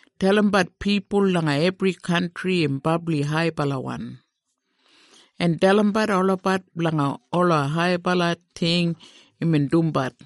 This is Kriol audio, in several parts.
Dalimbat pipul langa ebri kantri im brabli haibalawan, en dalimbat olabat blanga ola haibala ting imbin dumbat.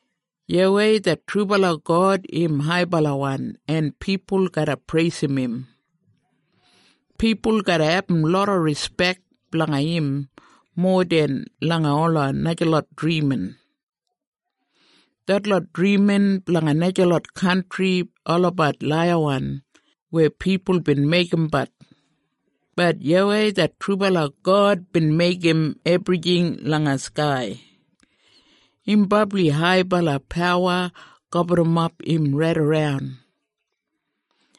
YAWEI det trubala God im haibalawan en pipul garra preisim im. Pipul garra abum loda rispek blanga im, mowa den langa ola najalot drimin. Detlot drimin blanga najalot kantri olabat laiyawan, weya pipul bin meigimbat, bat YAWEI det trubala God bin meigim ebrijing langa skai. Im brabli haibala pawa gaburrumap im raidaran.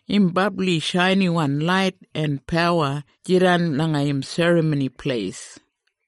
Im brabli shainiwan lait en pawa jidan langa im Serramoni Pleis.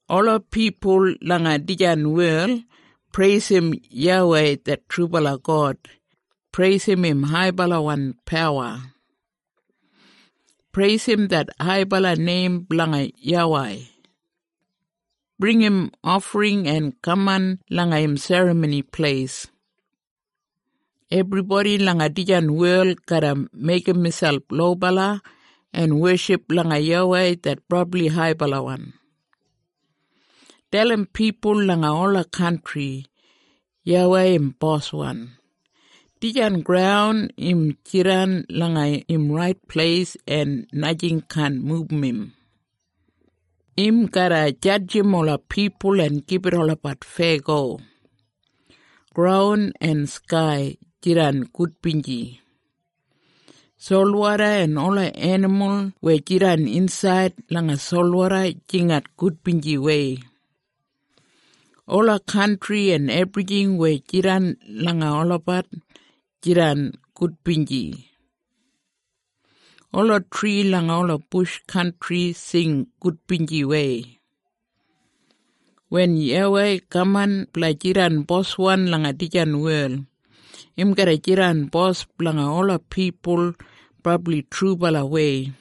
Ola pipul langa dijan wel preisim YAWEI det trubala God. Preisim im haibalawan pawa. Preisim det haibala neim blanga YAWEI. Bringim ofring en kaman langa im Serramoni Pleis. Ebribodi langa dijan wel garra meigim miselp lobala en weship langa YAWEI det brabli haibalawan. Dalim pipul langa ola kantri, “YAWEI im boswan! Dijan graun im jidan langa im rait pleis en najing kaan mubum im. Im garra jadjim ola pipul en gibit olabat feyago.” Graun en skai, jidan gudbinji. Solwoda en ola enimul weya jidan insaid langa solwoda jingat gudbinjiwei. Ola kantri en ebrijing weya jidan langa olabat, jidan gudbinji. Ola tri langa ola bush kantri sing gudbinjiwei. Wen YAWEI kaman blanga jidan boswan langa dijan wel, im garra jidan bos blanga ola pipul brabli trubalawei,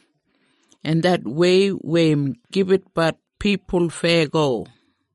en det wei weya im gibitbat pipul feyago.